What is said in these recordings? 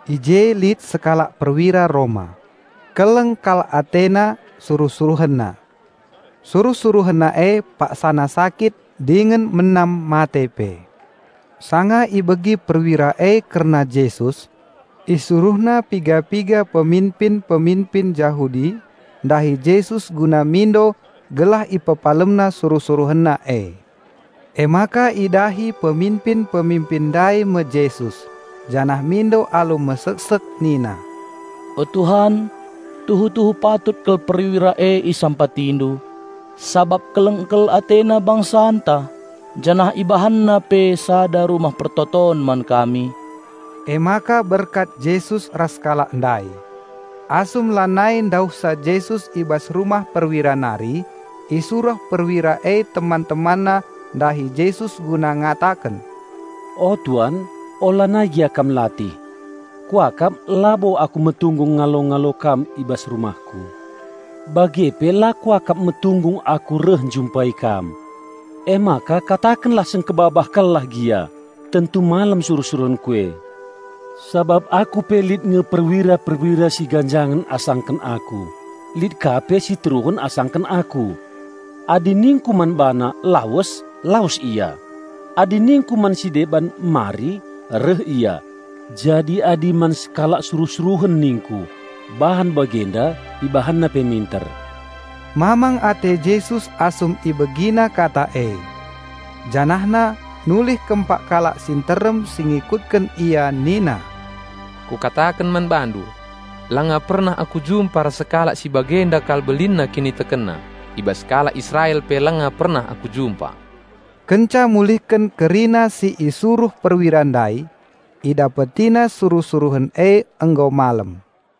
I je lit sekalak perwira Roma; keleng kal atena suruh-suruhenna. Suruh-suruhenna paksana sakit dingen menam mate pe. Sanga ibegi perwira e kerna Jesus, isuruhna piga-piga peminpin-peminpin Jahudi ndahi Jesus guna mindo gelah IpepalemNa suruh-suruhenna e. Emaka idahi peminpin-peminpin ndai me Jesus janah mindo alu meseksek nina, "O Tuhan, tuhu-tuhu patut kal perwira e isampatindu, sabap keleng kal atena bangsanta, janah ibahanna pe sada rumah persembahen man kami." Emaka berkat Jesus ras kalak ndai. Asum lanai ndauhsa Jesus i bas rumah perwira nari, isuruh perwira e teman-temanna ndahi Jesus guna ngataken, "O Tuan, ulanai gia Kam latih. Kuakap labo aku metunggung ngalo-ngalo Kam i bas rumahku, bage pe la kuakap metunggung aku reh njumpai Kam. Emaka katakenlah sengkebabah kal lah gia, tentu malem perajurit e. Sabap aku pe lit nge perwira-perwira si ganjangen asangken aku, lit ka pe si teruhen asangken aku. Adi ningku man bana, 'Lawes!', lawes ia; adi ningku man si deban 'Mari!', reh ia, jadi adi man sekalak suruh-suruhen ningku, 'Bahan bagenda!', ibahanna pe minter." Mamang ate Jesus asum IbegiNa kata e. JanahNa nulih kempak kalak si nterem si ngikutken Ia nina, "Kukataken man bandu: Langa pernah Aku jumpa ras sekalak si bagenda kal belinna kinitekenna. I bas kalak Israel pe langa pernah Aku jumpa." Kenca mulihken kerina si isuruh perwira ndai, idapetina suruh-suruhen e nggo malem.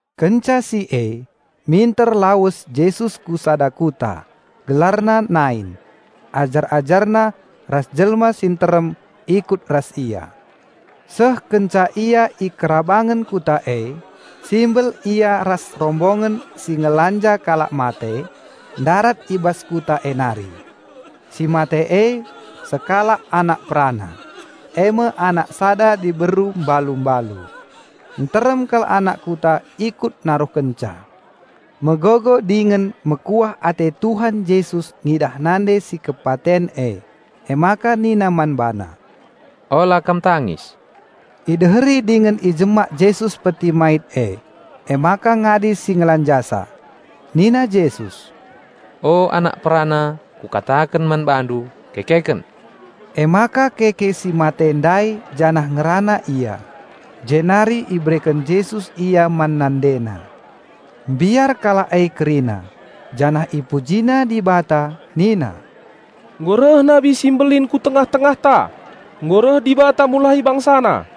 Kenca si e, minter lawes Jesus ku sada kuta, gelarna Nain; ajar-AjarNa ras jelma si nterem ikut ras Ia. Seh kenca Ia i kerabangen kuta e, simbel Ia ras rombongen si ngelanja kalak mate, ndarat i bas kuta e nari. Si mate e sekalak anak perana, e me anak sada diberu balu-balu. Nterem kal anak kuta ikut naruhkenca. Megogo dingen mekuah ate Tuhan Jesus ngidah nande si kepaten e, emaka nina man bana, "Ola kam tangis." Ideheri dingen ijemak Jesus peti mait e, emaka ngadi si ngelanjasa. Nina Jesus, "O anak perana, Kukataken man bandu: kekeken!" Emaka keke si mate ndai janah ngerana ia, jenari ibereken Jesus ia man nandena. Mbiar kalak e kerina, janah ipujina Dibata nina, "Nggo reh nabi si mbelin ku tengah-tengahta! Nggo reh Dibata mulahi BangsaNa!"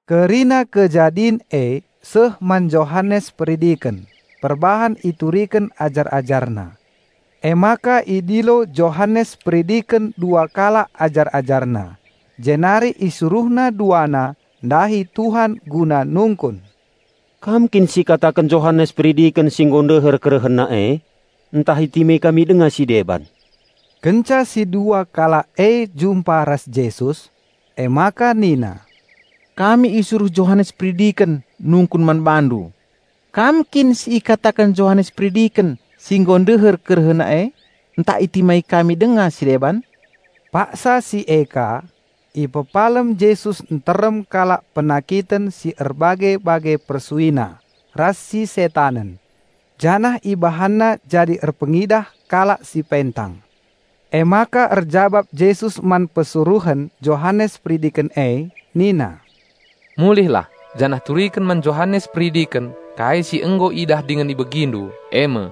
Kerina kejadin e seh man Johanes Peridiken perbahan ituriken ajar-ajarna. Emaka idilo Johanes Peridiken dua kalak ajar-ajarna, jenari isuruhna duana ndahi Tuhan guna nungkun, "Kam kin si ikataken Johanes Peridiken si nggo ndeher kerehenna e, ntah itimai kami denga si deban?" Kenca si dua kalak e jumpa ras Jesus, emaka nina, "Kami isuruh Johanes Peridiken nungkun man BaNdu, 'Kam kin si ikataken Johanes Peridiken si nggo ndeher kerehenna e, ntah itimai kami denga si deban?'" Paksa si e ka, ipepalem Jesus nterem kalak penakiten, si erbage-bage persuina si setanen, janah IpemedakNa kalak si pentang. Emaka erjabap Jesus man persuruhen Johanes Peridiken e, nina, "Mulihlah, janah turiken man Johanes Peridiken kai si nggo idah dingen ibegindu, e me: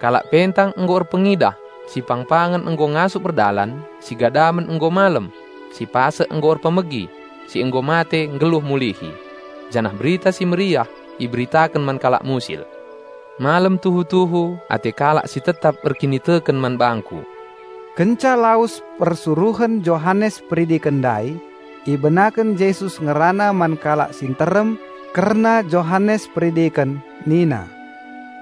kalak pentang nggo erpengidah, si pangpangen nggo ngasup erdalan, si gadamen nggo malem, si pasek nggo ngasup erpemegi, si nggo mate nggeluh mulihi, janah Berita Si Mehuli iberitaken man kalak musil. Malem tuhu-tuhu ate kalak si tetap erkiniteken man bangKu." Kenca lawes persuruhen Johanes Peridiken ndai, ibenaken Jesus ngerana man kalak si nterem kerna Johanes Peridiken nina,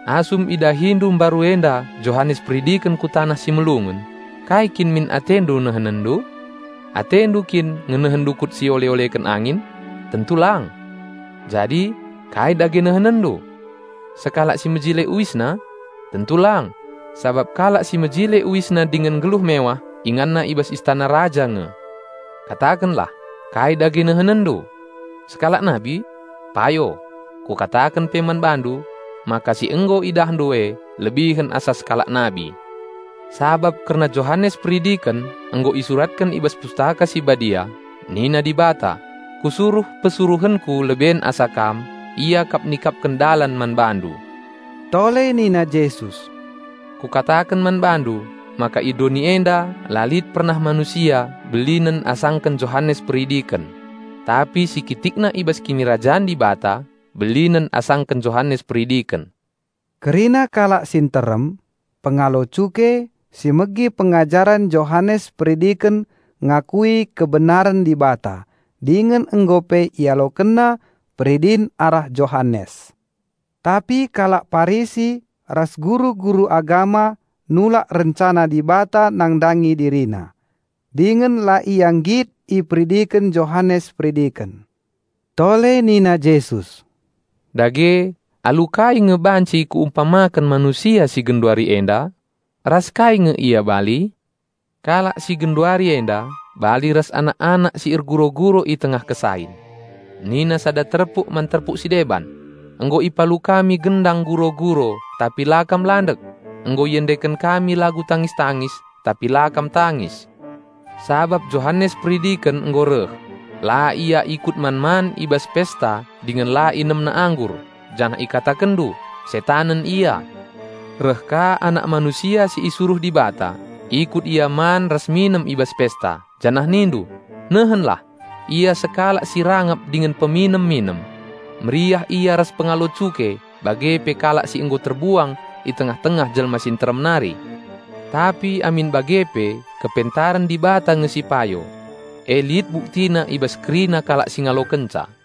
"Asum idahindu mbaru enda Johanes Peridiken ku taneh si melungun, kai kin min atendu nehenenndu? Atendu kin ngenehen dukut si iole-oleken angin? Tentu lang! Jadi, kai dage nehenenndu? Sekalak si mejile uisna? Tentu lang, sabap kalak si mejile uisna dingen nggeluh mewah inganna i bas istana raja nge. Katakenlah, kai dage nehenenndu? Sekalak nabi? Payo, Kukataken pe man bandu maka si nggo idahndu e lebihen asa sekalak nabi. Sabap kerna Johanes Peridiken nggo isuratken i bas Pustaka Si Badia, 'Nina Dibata: Kusuruh persuruhenKu leben asa Kam, ia kap nikapken dalan man BaNdu.'" Tole nina Jesus, "Kukataken man bandu maka i doni enda la lit pernah manusia belinen sangken Johanes Peridiken. Tapi si kitikna i bas Kinirajan Dibata belinen asangken Johanes Peridiken." Kerina kalak si nterem: pengalo cuke, si megi pengajaren Johanes Peridiken ngikutken pemindon Dibata, dingen nggo pe ialokenna peridin arah Johanes. Tapi kalak Parisi ras guru-guru agama nulak rencana Dibata nandangi dirina, dingen la ia nggit iperidiken Johanes Peridiken. Tole nina Jesus, "Dage alu kai nge banci Kuumpamaken manusia si genduari enda? Ras kai nge ia bali? Kalak si genduari enda bali ras anak-anak si erguro-guro i tengah kesain. Nina sada terpuk man terpuk si deban, 'Nggo ipalu kami gendang guro-guro tapi la kam landek! Nggo iendeken kami lagu tangis-tangis, tapi la kam tangis!' Sabap Johanes Peridiken nggo reh, la ia ikut man-man i bas pesta dingen la inemna anggur, janah ikatakenndu, 'Setanen ia!' Reh ka Anak Manusia si isuruh Dibata, ikut Ia man ras minem i bas pesta, janah nindu, 'Nehenlah! Ia sekalak si rangap dingen peminem-minem; meriah Ia ras pengalo cuke bage pe kalak si nggo terbuang i tengah-tengah jelma si nterem nari!' Tapi amin bage pe, kepentaren Dibata nge si payo. E lit buktina i bas kerina kalak si ngalokenca."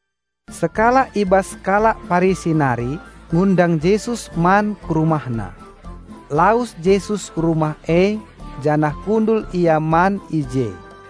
Sekalak i bas kalak Parisi nari ngundang Jesus man ku rumahna. Lawes Jesus ku rumah e janah kundul Ia man i je.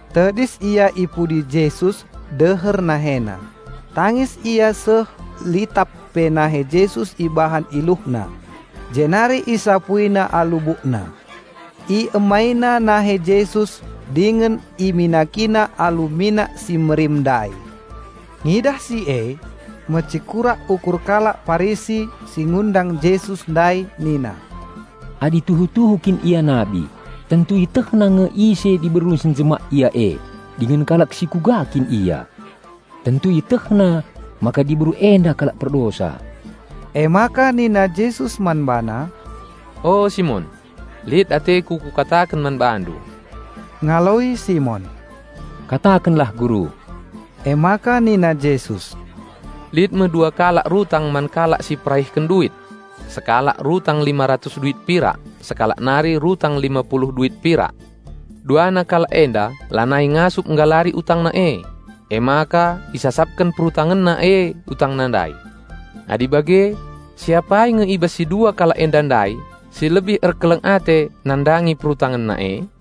Tedis ia i pudi Jesus deher NaheNa, tangis ia seh litap pe nahe Jesus ibahan iluhna, jenari isapuina alu bukna. Iemaina nahe Jesus dingen iminakina alu minak si merim ndai. Ngidah si e mecekurak ukur kalak Parisi si ngundang Jesus ndai nina, "Adi tuhu-tuhu kin Ia nabi, tentu IetehNa nge ise diberu si njemak Ia e dingen kalak si kuga kin ia. Tentu IetehNa maka diberu enda kalak perdosa." Emaka nina Jesus man bana, "O, Simon, lit ateKu Kukataken man bandu." Ngaloi Simon, "Katakenlah Guru." Emaka nina Jesus, "Lit me dua kalak rutang man kalak si peraihken duit. Sekalak rutang lima ratus duit pirak sekalak nari rutang lima puluh duit pirak. Duana kalak enda lanai ngasup nggalari utangna e, emaka isasapken perutangenna e utangna ndai. Adi bage, si apai nge i bas si dua kalak enda ndai si lebih erkeleng ate nandangi perutangenna e?"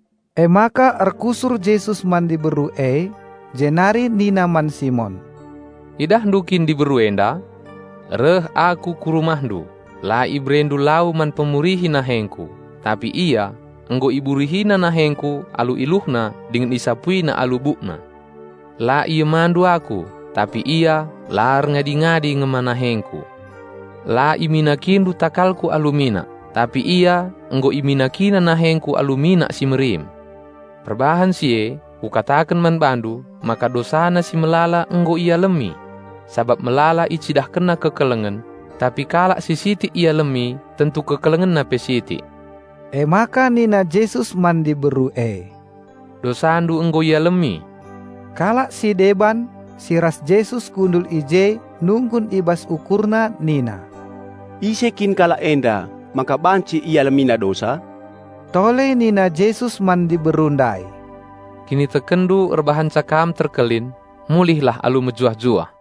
Emaka erkusur Jesus man diberu e, jenari nina man Simon, "Idahndu kin diberu enda? Reh Aku ku rumahndu, la iberendu lau man pemurihi nahengKu, tapi ia nggo iburihina nahengKu alu iluhna dingen isapuina alu bukna. La iemandu Aku, tapi ia la erngadi-ngadi ngema nahengKu. La iminakindu takalKu alu minak, tapi ia nggo iminakina nahengKu alu minak si merim. Perbahan si e, Kukataken man bandu maka dosana si melala nggo ialemi! Sabap melala icidahkenna kekelengen. Tapi kalak si sitik ialemi tentu kekelengenna pe sitik." Emaka nina Jesus man diberu e, "Dosandu nggo ialemi!" Kalak si deban si ras Jesus kundul i je nungkun i bas ukurna nina, "Ise kin kalak enda maka banci IalemiNa dosa?" Tole nina Jesus man diberu ndai, "Kinitekenndu erbahanca kam terkelin. Mulihlah alu mejuah-juah!"